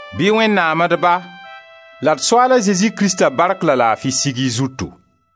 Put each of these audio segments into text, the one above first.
Bɩ Wẽnnaam d Ba la d Soaal a Zezi Krista bark la laafi sig y zutu!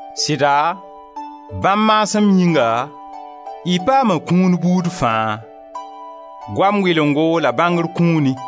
Sɩda bãmb maasem yĩnga, y paama kũun buud fãa: goam wɩlengo la bãngr kũuni.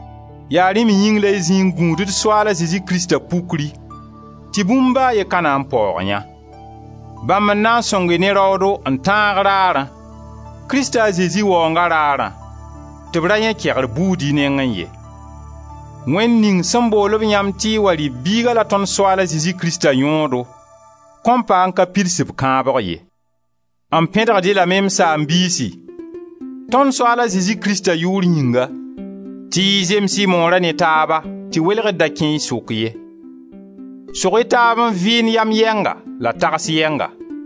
Yaa rẽ me yĩng la y zĩ n gũud d Soaal a Zezi Krista Ypkri tɩ bũmb ba a ye ka na n paoog yã. Bãmb n na n sõng-y ne raoodo n tãag raarã, Krista a Zezi Waoonga rarã tɩ b ra yãe kegr buud y nengẽ ye. Wẽnd ning sẽn bool-b yãmb tɩ y wa rɩ b Biiga la tõnd Soaal a Zezi Krista yõodo, kõn pa n ka pids b kãabg ye. M pẽdgd-y lame, m saam-biisi, tõnd Soaal a Zezi Krista yʋʋr yĩnga, tɩ y zems y moora ne taaba tɩ welgr da kẽ y sʋk ye. Sog-y taaba n vɩɩnd yam yɛnga, la tagsg yɛnga.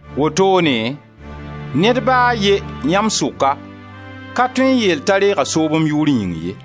Wotoone, ned ba a ye, yãmb sʋka, ka tõe n yeel t'a reega soob m yʋʋr yĩng ye.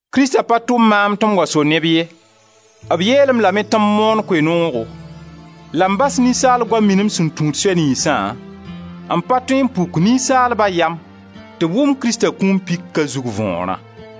Krista pa tʋm maam tɩ m wa so neb ye, b yeel-m lame tɩ m moon Koe-noogo, la m bas ninsaal goam minim sẽn tũud soy niynsã, n pa tõe n puk ninsaalba yam tɩ wʋm Krista kũum pika zug võorã.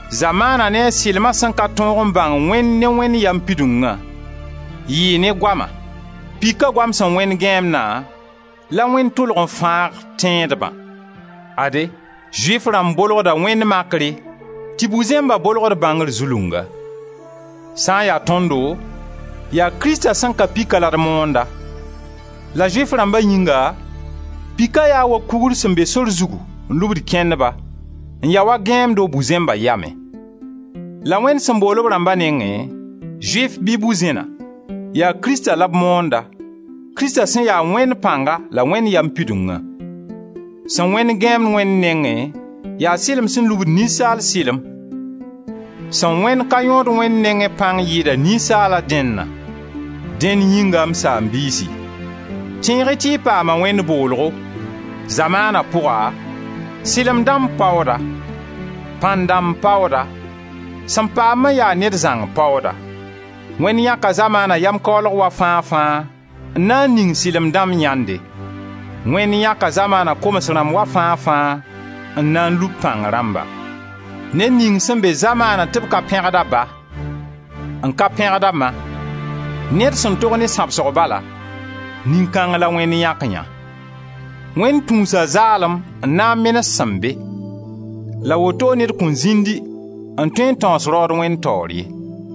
Zamaana ne a sɩlma sẽn ka tõog n bãng Wẽnd ne Wẽnd yam pidungã, yɩɩ ne goama, pika goam sẽn wẽnd gãeemdã, la Wẽnd tʋlg n fãag tẽedbã. Ade, Zʋɩf rãmb bolgda wẽnd makre tɩ bu-zẽmba bolgd bãngr zulunga. Sã n ya tõndo, yaa Krista sẽn ka pika la d moonda; la Zʋɩf rãmba yĩnga, pika yaa wa kugr sẽn be sor zugu n lubd kẽndba, n ya wa gãeemdo bu-zẽmba yamẽ. La Wẽnd sẽn bool b rãmba nengẽ, Zʋɩf bɩ bu-zẽna, yaa Krista la b moonda, Krista sẽn ya Wẽnd pãnga la Wẽnd yam pidungã. Sẽn wẽnd gãeemd Wẽnd nengẽ yaa sɩlem sẽn lubd ninsaal sɩlem, sẽn wẽnd ka yõod Wẽnd nengẽ pãng yɩɩda ninsaala dẽnna. Dẽnd yĩnga, m saam-biisi, tẽeg-y tɩ y paama Wẽnd boolgo. Zamaana pʋga, sɩlem dãmb paooda, pãn-dãmb paooda, sẽn paam-b n ya ned zãng paooda. Wẽnd yãka zamaana yam-kaoolg wa fãa-fãa n na n ning sɩlem dãmb yãnde; Wẽnd yãka zamaana koms rãmb wa fãa-fãa n na n lub pãng rãmba. Ned ning sẽn be zamaana tɩ b ka pẽgd a ba, n ka pẽgd a ma, ned sẽn tog ne sãbsgo bala, nin-kãng la Wẽnd yãk yã; Wẽnd tũusa zaalem n na n menes sẽn be. La woto ned kõn zĩndi n tõe n tãoos raood Wẽnd taoor ye.